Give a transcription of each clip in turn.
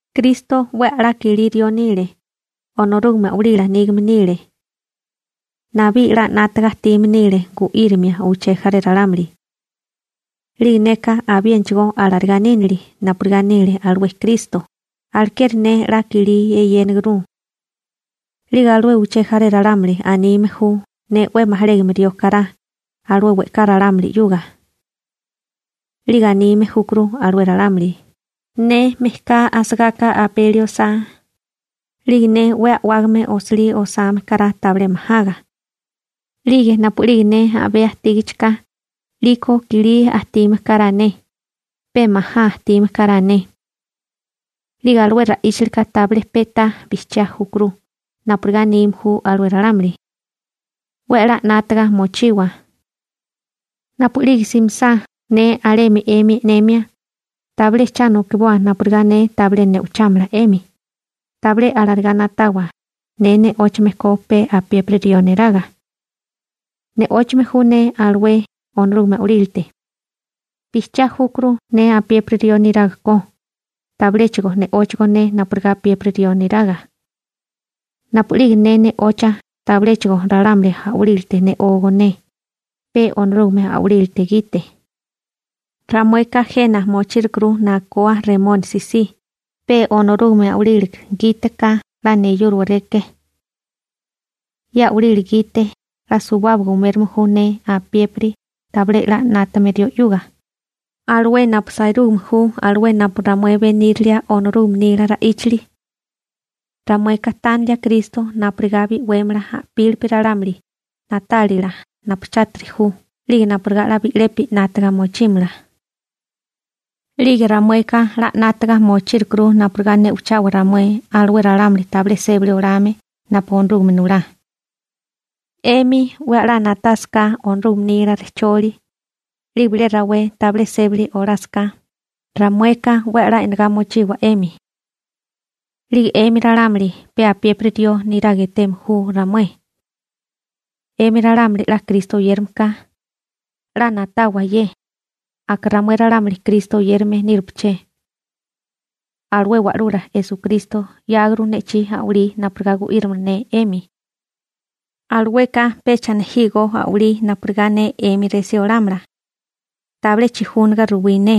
Kristo 'we a'lá kilí rió nile, Onorúgame a'walila nígame nile. Nabí 'la 'nátaga ajtime nile gu'írimia uché jaré ralámuli. 'Lige neka abiénachigó alarigá nínili napurigá nile alué Kristo, alekeri ne 'la kilí eyénaguru. 'Lige alué uché jaré ralámuli anime ju ne 'we majalégame rió kará alué we'ká ralámuli 'yuga. 'Lige anime júkuru alué ralámuli, ne mejká asagáká 'we a'wágame nulame osilí osame kará tabilé majaga. 'Lige napu'lige ne a'bé asagáká, 'liko i'kilí ajtime kará ne, pe majá ajtime kará ne. 'Lige alué ra'íchalika tabilé pe'tá bijchiá júkuru napurigá anime ju alué ralámuli. 'We 'la 'nátaga mochiwa. Napu'lige simisá ne alemi 'emi e'nemia, tabilé cha nokiboa napurigá ne tabilé ne'ochámala 'emi. Tabilé alarigá na'tawa ne ne'óchame ko pe apiépiri rió neraga. Ne'óchame ju ne alué Onorúgame a'walílate. Bijchiá júkuru ne apiépiri rió neraga ko, tabiléchigo ne'óchagó ne napurigá apiépiri rió niraga. Napu'lige ne ne'ocha, tabiléchigo ralámuli a'walílate ne'ógó ne, pe Onorúgame a'walílate gite. Ramueka jena mochírukuru nakoa Remónisi si pe Onorúgame a'walílate gite ka 'la neyúrowareké. Ye a'walila gite 'la suwábaga umérome ju ne apiépiri tabilé 'la 'nátame rió 'yuga, alué napu sairúgame ju alué napu ramué benírilia Onorúgame nila ra'íchali. Ramueka tánilia Kristo napurigá bi'wémala a'pílipi ralámuli na'tálila napu chátiri ju 'lige napurigá 'la bi'lepi 'nátaga mochímala. 'Lige ramueka 'la 'nátaga mochírukuru napurigá ne'ochawa ramué alué ralámuli tabilé sébali olame napu Onorúgame nulá. 'Emi 'we a'lá na'tásaká Onorúgame nila rejcholi, 'lige bilé rawé tabilé sébali olásaká, ramueka 'we 'la e'negá mochiwa 'emi. 'Lige 'emi ralámuli pe apiépiri rió neraga eteme ju ramué. 'Emi ralámuli 'la Kristo oyérame ka, 'la na'tawa ye: Aka ramué ralámuli Kristo oyérame nírupaché. Alué Wa'lula Esukristo 'yáguru ne'chí a'walí napurigá gu'írimala ne 'emi. Alueka pecha nejígó a'walí napurigá ne 'emi resí olámala. Tabilé chijúniga ruwí ne.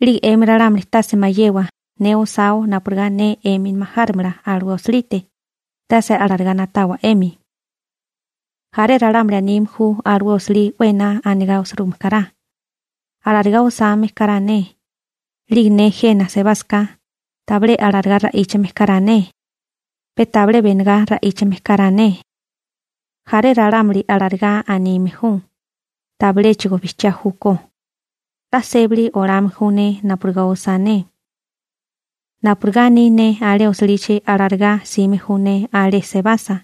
'Lige 'emi ralámuli tase mayewa ne osáo napurigá ne 'emi majárimala alué osilite, tase alarigá na'tawa 'emi. Jaré ralámuli anime ju alué osilí 'we ená anigá osirúgime kará, alarigá osame kará ne, 'lige ne jena sebásaká, tabilé alarigá ra'íchame kará ne, pe tabilé benegá ra'íchame kará ne. Jaré ralámuli alarigá anime ju, tabiléchigo bijchiá júkó. 'La sébali olame ju ne napurigá osá ne. Napurigá aní ne alé osilichi alarigá 'sime ju ne alé sebasa.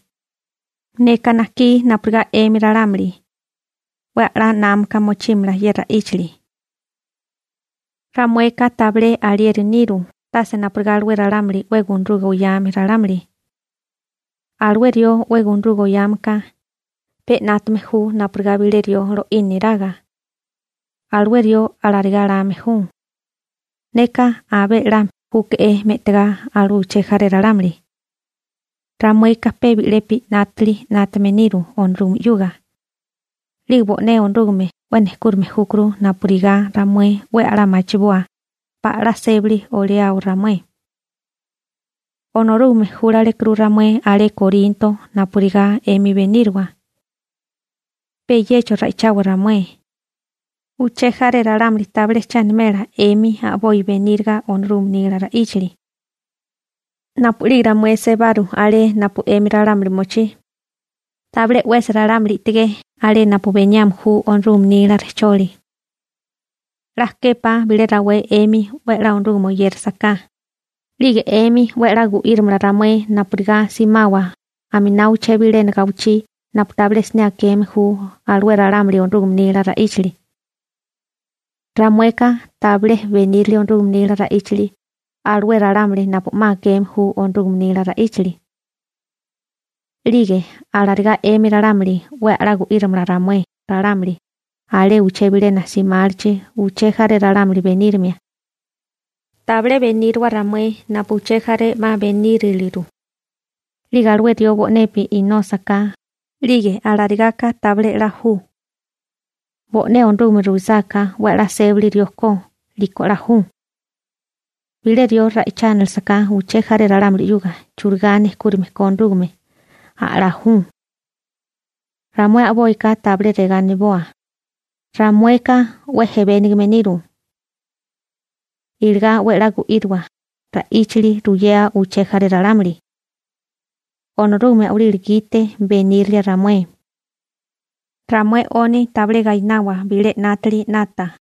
Neka najkí napurigá 'emi ralámuli 'we a'lá námaka mochímala ye ra'íchali. Ramueka tabilé alieri niru tase napurigá alué ralámuli 'we gunaruga oyame ralámuli. Alué rió 'we gunaruga oyame ka, pe 'nátame ju napurigá bilé rió lo'í niraga. Alué rió alarigá lame ju: «Neka abé 'la júke'é me'tigá alué uché jaré ralámuli.» Ramueka pe bi'lepi 'nátili 'nátame niru Onorúgame 'yuga. 'Lige bo'né Onorúgame 'we nejkúrime júkuru napurigá ramué 'we a'lá machiboa pala 'la sébali oliao ramué. Onorúgame júlalekuru ramué alé Korinto napurigá 'emi beníriwa. Pe yecho ra'ichawa ramué. Uché jaré ralámuli tabilé che animela 'emi a'boi beníriga Onorúgame nila ra'íchali. Napu'lige ramué sebaru alé napu 'emi ralámuli mochí, tabilé 'wesi ralámuli i'tigé alé napu beniame ju Onorúgame nila rejcholi. 'La képá bilé rawé 'emi 'we 'la Onorúgame oyérasaká, 'lige 'emi 'we a'lá gu'írimala ramué napurigá simawa aminá uché bilena gawichí napu tabilé siné akeme ju alué ralámuli Onorúgame nila ra'íchali. Ramueka tabilé benírili Onorúgame nila ra'íchali alué ralámuli napu 'ma akeme ju Onorúgame nila ra'íchali. 'Lige alarigá 'emi ralámuli 'we a'lá gu'írimala ramué ralámuli alé uché bilena simálichi uché jaré ralámuli benírimia. Tabilé beníriwa ramué napu uché jaré 'ma beníriliru. 'Lige alué rió bo'nepi inósaká, 'lige alarigaka tabilé 'la ju. Bo'né Onorúgame ruisáká 'we a'lá sébali rió ko, 'liko 'la ju. Bilé rió ra'ichánalesaká uché jaré ralámuli 'yuga churigá nejkúrime ko Onorúgame, a'lá ju. Ramué a'boika tabilé regá aniboa: «Ramueka 'we ejebénegame niru.» Iligá 'we a'lá gu'íriwa ra'íchali ruyea uché jaré ralámuli. Onorúgame a'walila gite benírilia ramué. Ramué 'oni tabilé gainawa bilé 'nátili 'nata.